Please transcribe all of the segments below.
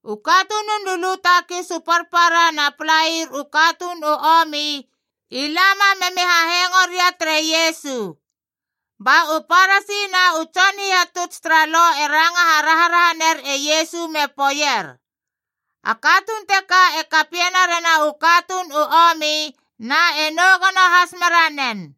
U katunun lulu takis u parpara na palair u katuun u omi i lama memi hahengo ria tere Iesu. Ba u Parasi na u tson hihatuts tara Lo e ranga haraharaha ner e Iesu me poeier, “A katuun teka e kapiena rena u katuun u omi na e nou gono has mera nen!”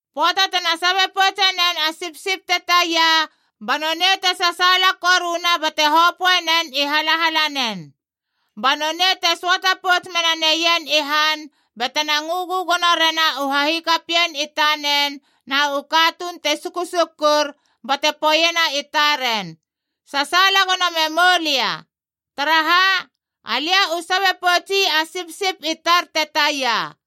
Pöata tena sabe poutse nen a sipsip te taia, ba nonei te sasaala koruna bate hopöe nen i halahalanen. Ba nonei te söata pouts mena neien i han batena ngö gögono rena u hahikapien i tanen na u katuun te sukusukur bate poeiena i taren, ‘Sasaala gono memoulia. Taraha? Alia u sabe poutsi a sipsip i tar te taia!’”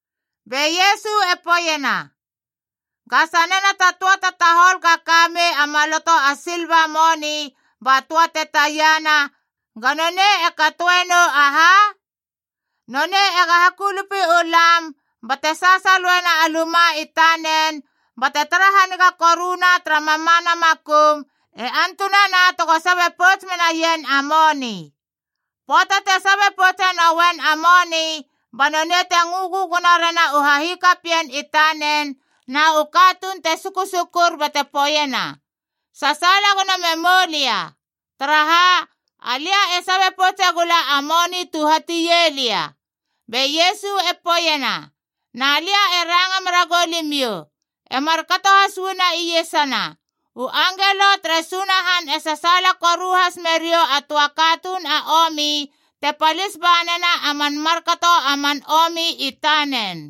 Be Iesu e poeiena, “Ga sanena ta töa ta tahol ga ka mei a maloto a silva moni ba töa te tiana, ga nonei e katoe nou aha? Nonei ega hakulupi u lam, bate sasaloena a luma i tanen, bate tara haniga koruna tara mamana makum, e antunana tego sabe pouts menaien a moni. Pöata te sabe poutse nouen a moni, ba nonei te ngö gögono rena u hahikapien i tanen na u katuun te sukusukur bate poeiena, ‘Sasaala gono memoulia. Taraha? Alia e sabe poutse gula a moni tu hatie lia.’” Be Iesu e poeiena, “Na lia e ranga mera goulimiou, e markato has uana iesana, u angelo tere Sunahan e sasaala koru has meriou a töa katuun a omi te palis banena a man markato a man omi i tanen.”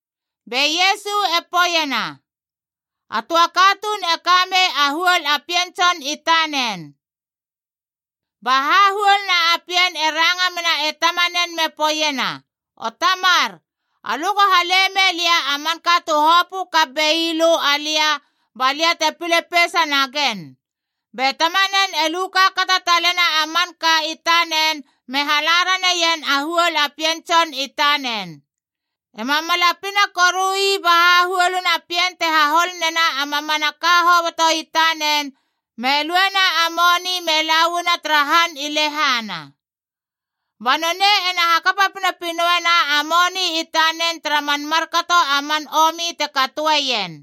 Be Iesu e poeiena, “A töa katuun e ka mei a huol a pien tson i tanen. Ba hahuoluna a pien e ranga mena e tamanen me poeiena, ‘O Tamar, alö go hale mei lia a manka tu hopö kap bei lö alia ba lia te pile peisa nagen.’ Be tamanen e lu kaakata talena a manka i tanen me hala raneien a huol a pien tson i tanen. Ema mala pina koru ii ba hahuolina a pien te hahol nena a mamanaka hoboto i tanen me luena a moni me la uana tara han i lehana. Ba nonei ena hakapa pinopinoena a moni i tanen tara man markato a man omi te katoeien.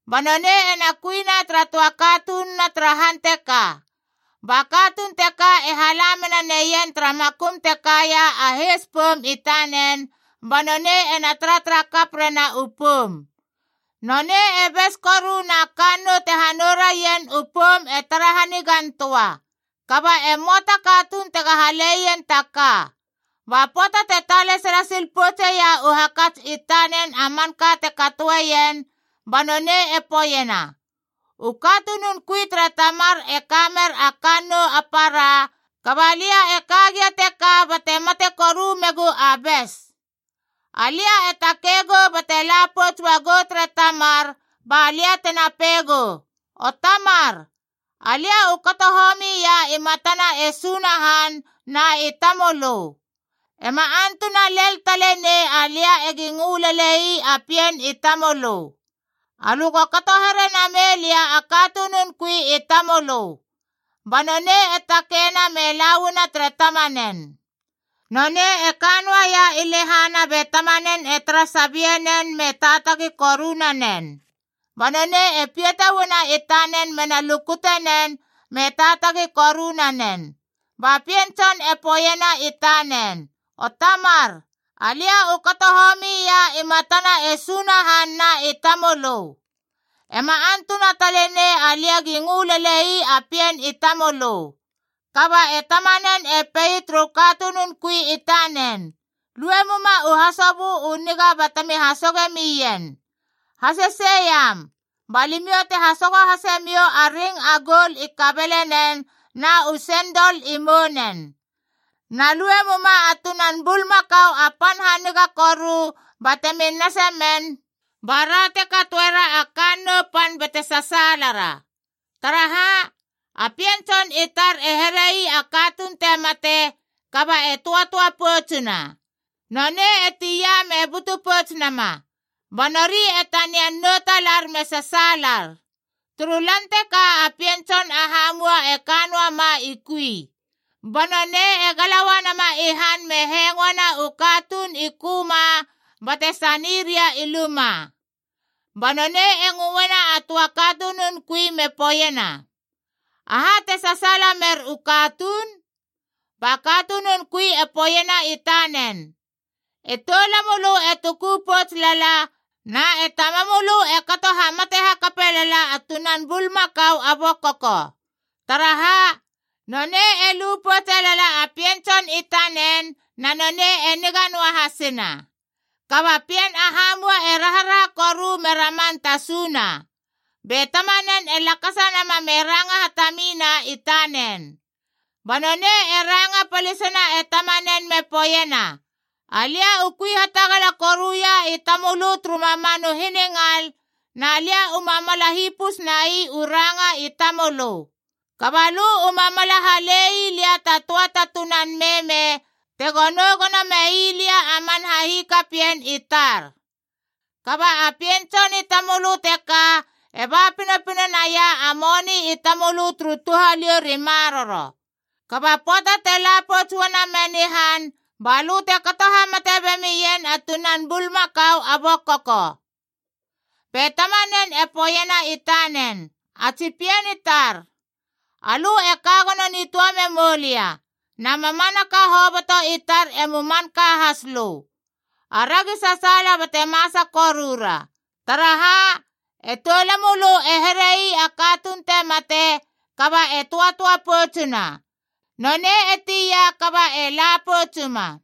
Ba nonei ena kuina tara töa katununa tara han teka. Ba katuun teka e hala mena neien tara makum te kaia a heis poum i tanen, ba nonei ena taratara kap rena u poum. Nonei e bes koru na kannou tena hanou raien u poum e tara hanigan töa. Kaba e möa ta katuun tega haleien ta ka. “Ba pöata te talesala sil poutseia u hakats i tanen a manka te katoeien, ba nonei e poeiena, ‘U katunun kui tere tamar e ka mer a kannou a para, kaba lia e ka gia teka bate mate koru megu a bes! Alia e takei gou bate la pouts uagou tere tamar ba lia tena pei gou, O Tamar, alia u kato homi ia i matana e Sunahan na i tamölö. Ema antuna len tale nei alia egi ngö lelei a pien i tamölö. Alö go kato here namei lia a katunun kui i tamölö.’ Ba nonei e takeina me la uana tere tamanen. “Nonei e ka noaia i lehana be tamanen e tara sabie nen me taatagi koru nanen. Ba nonei e piata uana i tanen mena lukute nen me taatagi koru nanen. Ba pien tson e poeiena i tanen, ‘O Tamar, alia u kato homi ia i matana e Sunahan na i tamölö. Ema antuna tale nei alia gi ngö lelei a pien i tamölö.’ Kaba e tamanen e pei turu katunun kui i tanen, ‘Lue muma u hasobö u niga batemi hasoge mien. Hasesei iam! Ba limiou te hasogo hase miou a ring a goul i kabelenen na u sendol i mounen! Na lue muma a tunan bulmakau a pan haniga koru batemi nase men, ba ra te katoera a kannou pan bate sasaalara. Taraha? A pien tson i tar e here ii a katuun te mate, kaba e töatöa poutsuna. Nonei e tia me butu pouts nama.’ Ba nori e tanian nou talar me sasaalar. “Turu lan teka a pien tson a hamua e ka noa ma i kui. Ba nonei e gala uanama i han me hengoena u katuun i köma bate sani ria i luma. Ba nonei e ngöena a töa katunun kui me poeiena, ‘Aha te sasaala mer u katuun?’ Ba katunun kui e poeiena i tanen, ‘E toulamölö e tuku pouts lala na e tamamölö e kato hamate hakape lala a tunan bulmakau a bokoko. Taraha? Nonei e lu poutse lala a pien tson i tanen na nonei e niga noa hasina.’ Kaba pien a hamua e raharaha koru me raman tasuna. Be tamanen e lakasa nama me ranga hatamina i tanen. Ba nonei e ranga palisena e tamanen me poeiena, ‘Alia u kui hatagala koruia i tamölö turu mamanu hiningal, na lia u mamala hipus nai u ranga i tamölö. Kaba lö u mamala hale ii lia ta töa ta tunan meme tego nou gono mei lia a man hikapien i tar. Kaba a pien tson i tamölö teka e ba pinopino naia a moni i tamölö turu touhaliou ri maroro! Kaba pöata te la pouts uana men i han, ba lö te kato hamate bemien a tunan bulmakau a bokoko!’ Be tamanen e poeiena i tanen, ‘A tsi pien i tar, alö e ka gono nitöa memou lia, na mamanaka hoboto i tar emu manka has lö. Aragi sasaala bate masa korura. Taraha? E toulamölö e here ii a katuun te mate, kaba e töatöa poutsuna! Nonei e tia kaba e la poutsuma!’”